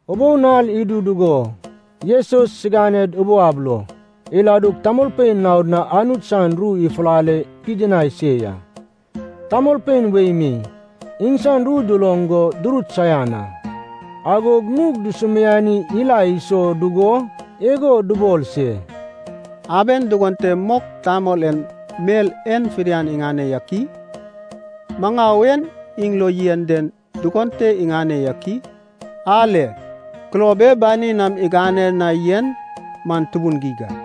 Ubou nal idu dugo Jesus siganed ubou ab lo iladug tamolpein naod na Anut san ru ifulale pidinai se ya. Tamolpein wei mi iŋsan ru duloŋ go durut saian a. Agog nug dusumiani ila iso dugo igo dubol se, “Aben dugon te mok tamol en mel en fidian iŋane yak i? Maŋau e iŋ lo yen den dugon te iŋane yak i? Ale, kulob e banin nam igane na yen man tubun geig a!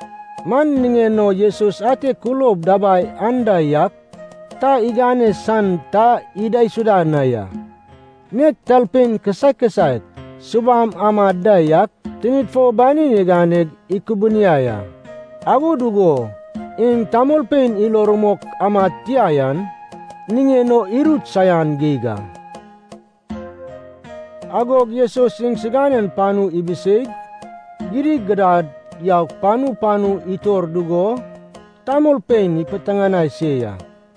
Man niŋen o Jesus ante kulob dabai anda yak ta igane san ta idaisuda na ya. Nek talpein kisaek kisaek subam amad da yak tinid fo banin iganeg ikubuniai a. Ago dugo iŋ tamolpein ilo rumok amad tia yan niŋen o irut saian geig a. Agog Jesus iŋsiganen panu ibiseig gidigidad yaug panu panu itor dugo tamolpein ipiteŋanai se ya.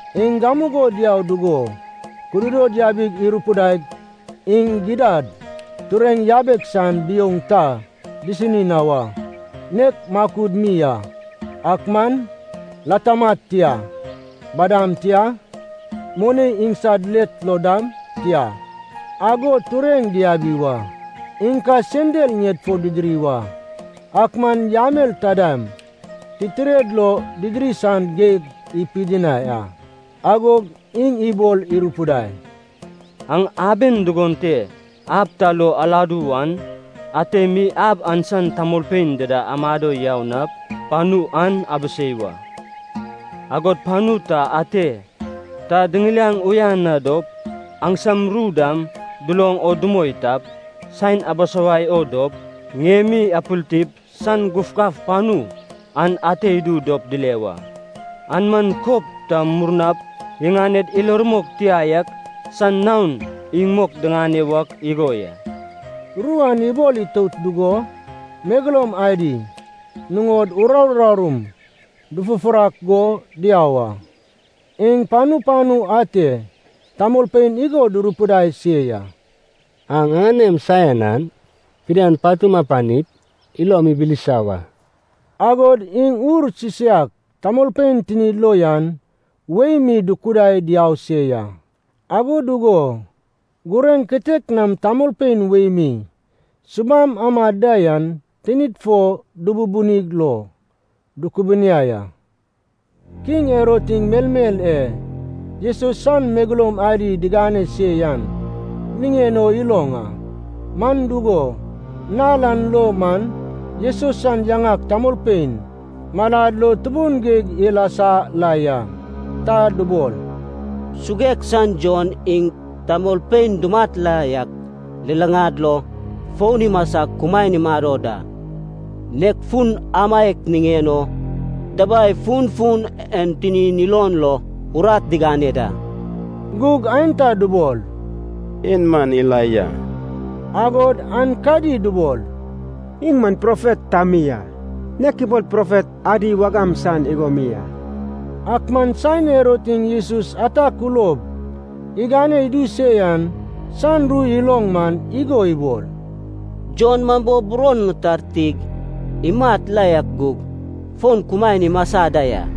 Iŋ gamugo diau dugo kududod yabig irupidaig iŋ gidad tureŋ yabek san biouŋ ta disini na wa, nek makud mi a. Ak man latamad tia, badam tia, moni iŋsad let lo dam tia, ago tureŋ diabi wa. Iŋ ka sendal ŋied fo didiri wa, ak man yamel taidam titired lo didiri san geg ipidinai a. Agog iŋ ibol irupidai, “Aŋ aben dugon te ab ta lo aladu wan, ate mi ab an san tamolpein dida amado yau nap panu an abisei wa. Agod panu ta ate ta diŋiliaŋ uyan dop aŋsam ru dam duloŋ o dumoi tap, saen abisawai o dop, ŋiemi apiltip san gufgaf panu an ate idu dop dile wa. An man kob ta murnap iŋaned ilo rumok tia yak san naon iŋ mok diŋane wak igo ya.” Ru an ibol itout dugo megeloum adi nuŋod uraru urarum dufufurak go diau a. Iŋ panu panu ate tamolpein igo durupidai se ya. “Aŋ aŋanem saian an fidian patum apanip ilom ibilisa wa.” Agod iŋ ur sisaiak tamolpein tinid lo yan wei mi dukudaig diau se ya. Ago dugo gureŋ kitek nam tamolpein wei mi subam amad da yan tinid fo dububunig lo dukubuniai a. Kiŋ Herod iŋ melmel e Jesus san megeloum adi digane se yan niŋen o iloŋ a. Man dugo, nal an lo man Jesus san yaŋak tamolpein malad lo tubun geig ilasa la ya. Ta dubol, “Suguek san Jon iŋ tamolpein dumat la yak luluŋad lo fon imasag kumaen imado da, nek fun amaiak niŋen o dabai funfun en tinin ilon lo urat digane da.” Gug aenta dubol, “En man Elaija.” Agod aenkadi dubol, “Iŋ man profet ta mi a, nek ibol profet adi wagam san igo mi a.” Ak man saen Herod iŋ Jesus ata kulob igane idu se yan san ru iloŋ man igo ibol, “Jon man bo buron ŋitartig imat la yak gug fon kumaen imasa da ya.”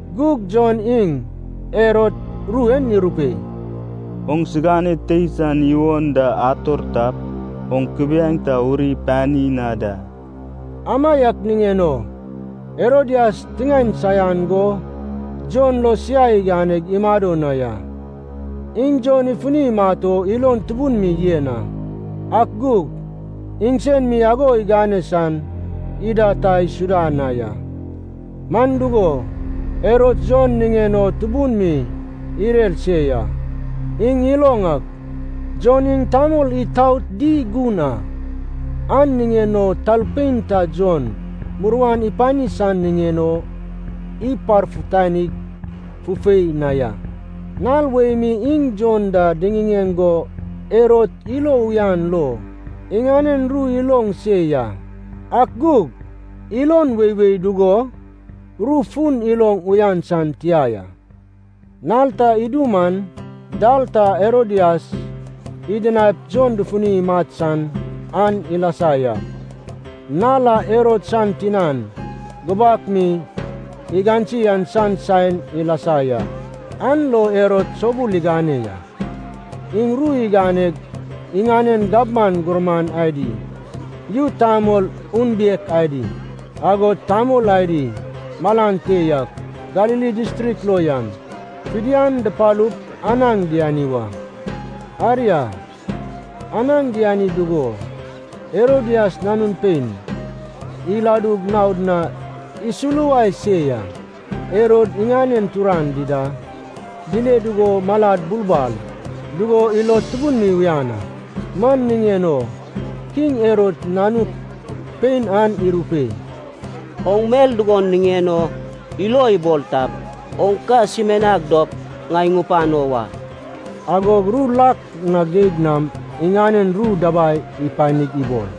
Gug Jon iŋ Herod ru en irupei, “Oŋsigane tei san iwon da ator tap, oŋ kubiaeŋ ta uri pani na da.” Amaiak niŋen o Herodias tiŋaen saian go Jon lo siai iganeg imado na ya. Iŋ Jon ifuni imat o ilon tubun mi yen a, ak gug iŋsen mi ago igane san ida ta isuda na ya. Man dugo, Herod Jon niŋen o tubun mi irer se ya. Iŋ iloŋ ak Jon iŋ tamol itaot di gun a, an niŋen o talpein ta Jon muruan ipani san niŋen o iparfutani fufei na ya. Nal wei mi iŋ Jon da diŋiŋeŋ go Herod ilo uyan lo iŋanen ru iloŋ se ya. Ak gug ilon weiwei dugo ru fun iloŋ uyan san tia ya. Nal ta idu man dal ta Herodias idinaip Jon dufuni imat san an ilasa ya. Nal a Herod san tinan gubak mi igansi an san saen ilasa ya, an lo Herod soubul igane ya. Iŋ ru iganeg iŋanen gabman gurman adi, yu tamol unbiek adi, agod tamol adi malan te yak Galili distrik lo yan, fidian dupalup anaŋ diani wa. Aria, anaŋ diani dugo Herodias nanun pein iladug naod na isuluwai se ya. Herod iŋanen turan dida dile dugo malad bulbal dugo ilod tubun mi uyan a. Man niŋen o kiŋ Herod nanuk pein an irupei, “Oŋ mel dugon niŋen o ilo ibol tap, oŋ ka sumianag dop ŋai ŋupano wa.” Agog ru lak na geig nam iŋanen ru dabai ipanig ibol,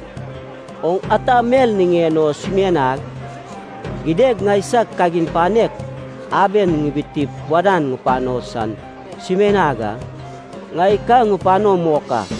“Oŋ ata mel niŋen o sumianag, gidad ŋaisag kagin panek aben ŋibitip wadan ŋupano san sumianag a, ŋai ka ŋupano mok a.”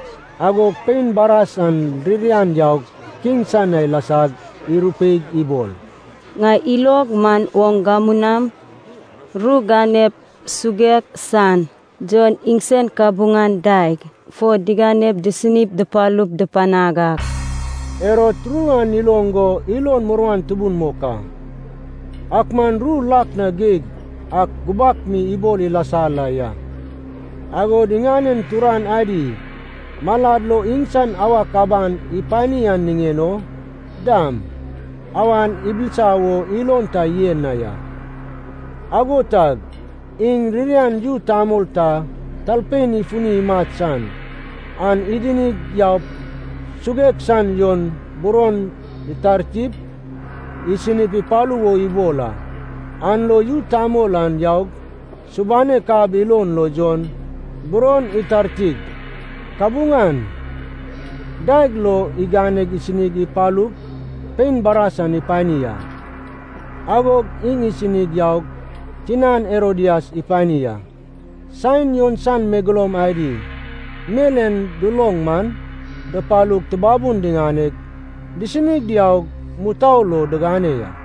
Agog pein baras an ririan yaug kiŋ san na ilasag irupeig ibol, “Ŋai ilog man oŋ gamu nam ru ganep suguek san Jon iŋsan kabuŋan daeg fo diganep disini dupalup dupanag a.” Herod ru an iloŋ go ilon muruan tubun mok a. Ak man ru lak na geig an gubak mi ibol ilasa la ya, agod iŋanen turan adi malad lo iŋsan awak aban ipani an niŋen o dam, awan ibilisa wo ilon ta yen na ya. Ago tag iŋ ririan yu tamol ta talpein ifuni imat san an idinig yaup suguek san Jon buron itartip isini ipalu wo ibol a. An lo yu tamol an yaug, subanek ab ilon lo Jon buron itartig, kabuŋan daeg lo iganeg isini ipalug pein baras an ipani a. Agog iŋ isini yaug tinan Herodias ipani a. Saen Jon san megeloum adi mel en duloŋ man, dupalug tubabun diŋaneg disini diaug mutou lo digane ya.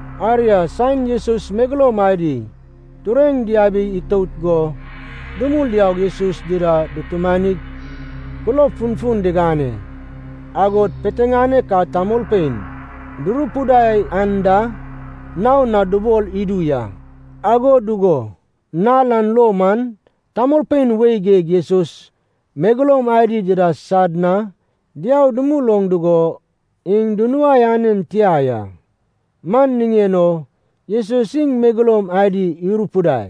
Aria, saen Jesus san megeloum adi tureŋ diabig itout go dumul diaug Jesus dida dutumanig kulob funfun digane, agod piteŋanek a tamolpein durupidai an da, naon na dubol idu ya. Ago dugo nal an lo man tamolpein wei geig Jesus megeloum adi dida sad na diau dumul oŋ dugo iŋ dunuai anen tia ya. Man niŋen o Jesus iŋ megeloum adi irupidai,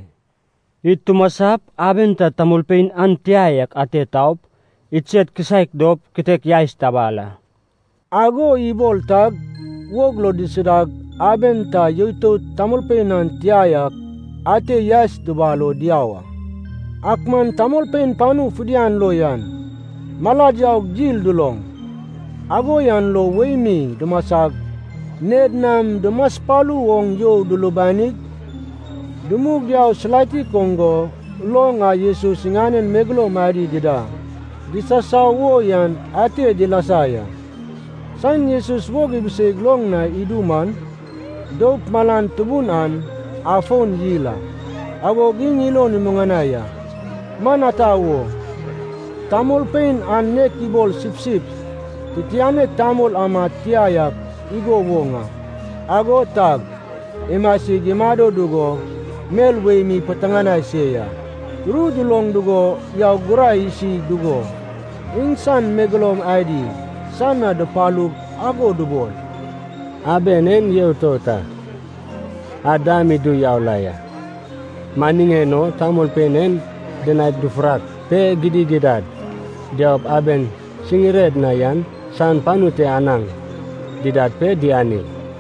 “Id tumasap, aben ta tamolpein an tia yak ate taup, idsed kisaek dop kitek yaes tabal a.” Ago ibol tag wog lo disidag, aben ta yoitout tamolpein an tia yak ate yaes dubal o diau a. Ak man tamolpein panu fidian lo yan malad yaug dil duloŋ, ago yan lo wei mi dumasag ŋied nam dumaspalu oŋ you dulubanig, dumug diau silatik oŋ go, loŋ a Jesus iŋanen megeloum adi dida disasau wo yan ate dilasa ya. Saen Jesus wog ibiseig loŋ na idu man, doup malan tubun an afon yil a. Agog iŋ ilon imuŋanai a, man ata wo, tamolpein an nek ibol sipsip titianek tamol amad tia yak igo woŋ a. Ago tag imasig imado dugo mel wei mi ipiteŋanai se ya. Ru duloŋ dugo yaug gurai isi dugo, iŋsan megeloum adi san na dupalug ago dubol, “Aben en yoitout a, ad dam idu yau la ya. Man niŋen o tamolpein en dinaip dufurak pe gidigidad diaup aben siŋired na yan san panu te anaŋ didad pe diani.”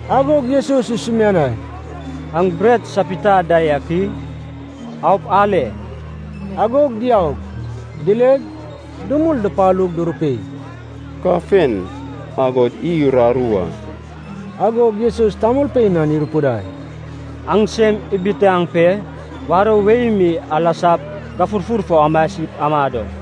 Agog Jesus isumianai, “Aŋ bret sapita da yak i? Aup ale.” Agog diaug dileg dumul dupalug durupei, “Kafen, agod iy uraru a.” Agog Jesus tamolpein an irupidai, “Aŋ sem ibitaŋ pe warou wei mi alasap gafurfur fo amasip amado.”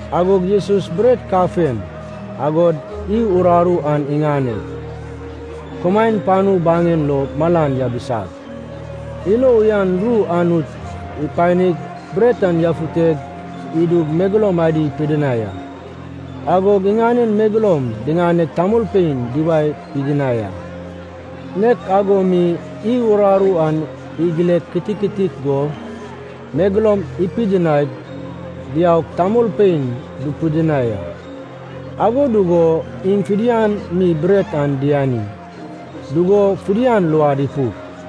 Agog Jesus bret kafen agod iy uraru an iŋaneg, kumaen panu baŋen lo malan yabisag, ilo uyan ru Anut ipanig bret an yafute idug megeloum adi ipidinai a. Agog iŋanen megeloum diŋaneg tamolpein duwae pidinai a. Nek ago mi iy uraru an igile kititik go megeloum ipidinaig diaug tamolpein dupidinai a. Ago dugo iŋ fidian mi bret an diani dugo fidian luad ipuk.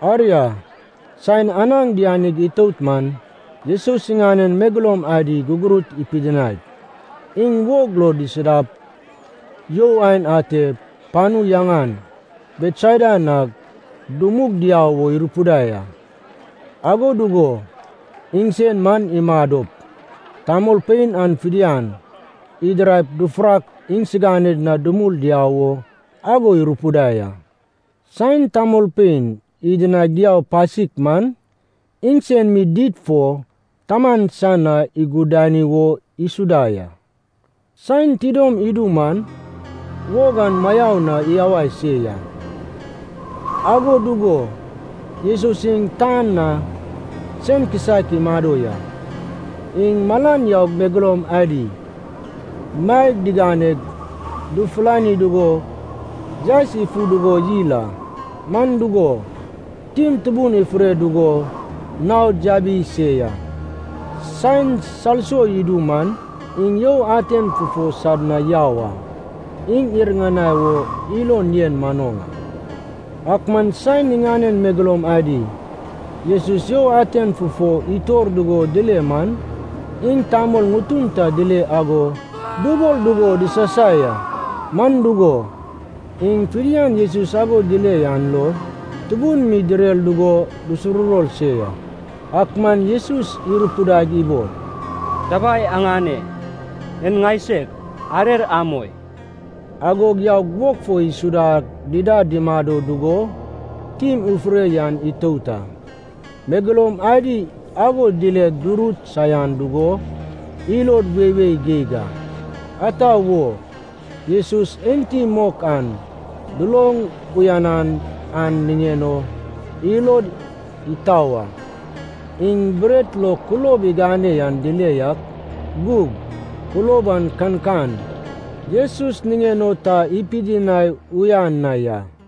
Aria, saen anaŋ dianig itout man, Jesus iŋanen megeloum adi gugurut ipidinaig, iŋ wog lo disidap you aen ate panu yaŋan Betsaida na dumug diau wo irupidai a. Ago dugo iŋsen man imadop, tamolpein an fidian idiraip dufurak iŋsiganed na dumul diau wo, ago irupidai a. Saen tamolpein idinaig diau pasik man, iŋ sen mi did fo Taman san na igudani wo isuda ya. Saen tidom idu man, wog an mayau na iyawai se ya, ago dugo Jesus iŋ tan na sen kisaek imado ya. Iŋ malan yaug megeloum adi maeg diganeg dufulani dugo yaes ifu dugo yil a. Man dugo, tim tubun ifure dugo naod yabi se ya. Saen salso idu man, iŋ you aten fufo sad na yau a. Iŋ iriŋanai o ilon yen manoŋ a. Ak man saen iŋanen megeloum adi Jesus you aten fufo itor dugo dile man, iŋ tamol ŋutun ta dile ago dubol dugo disasai a. Man dugo, iŋ fidian Jesus ago dile an lo tubun mi direr dugo dusuruwor se ya. Ak man Jesus irupidaig ibol, “Dabai aŋane, en ŋaiseg, arer amoi!” Agog yaug wog fo isudag dida dumado dugo tim ifure yan itout a. Megeloum adi ago dileg durut saian dugo ilod weiwei geig a. Ata wo? Jesus enti mok an duloŋ uyanan an niŋen o ilod itau a, iŋ bret lo kulob igane an dile yak gug kulob an kankan Jesus niŋen o ta ipidinai uyan na ya.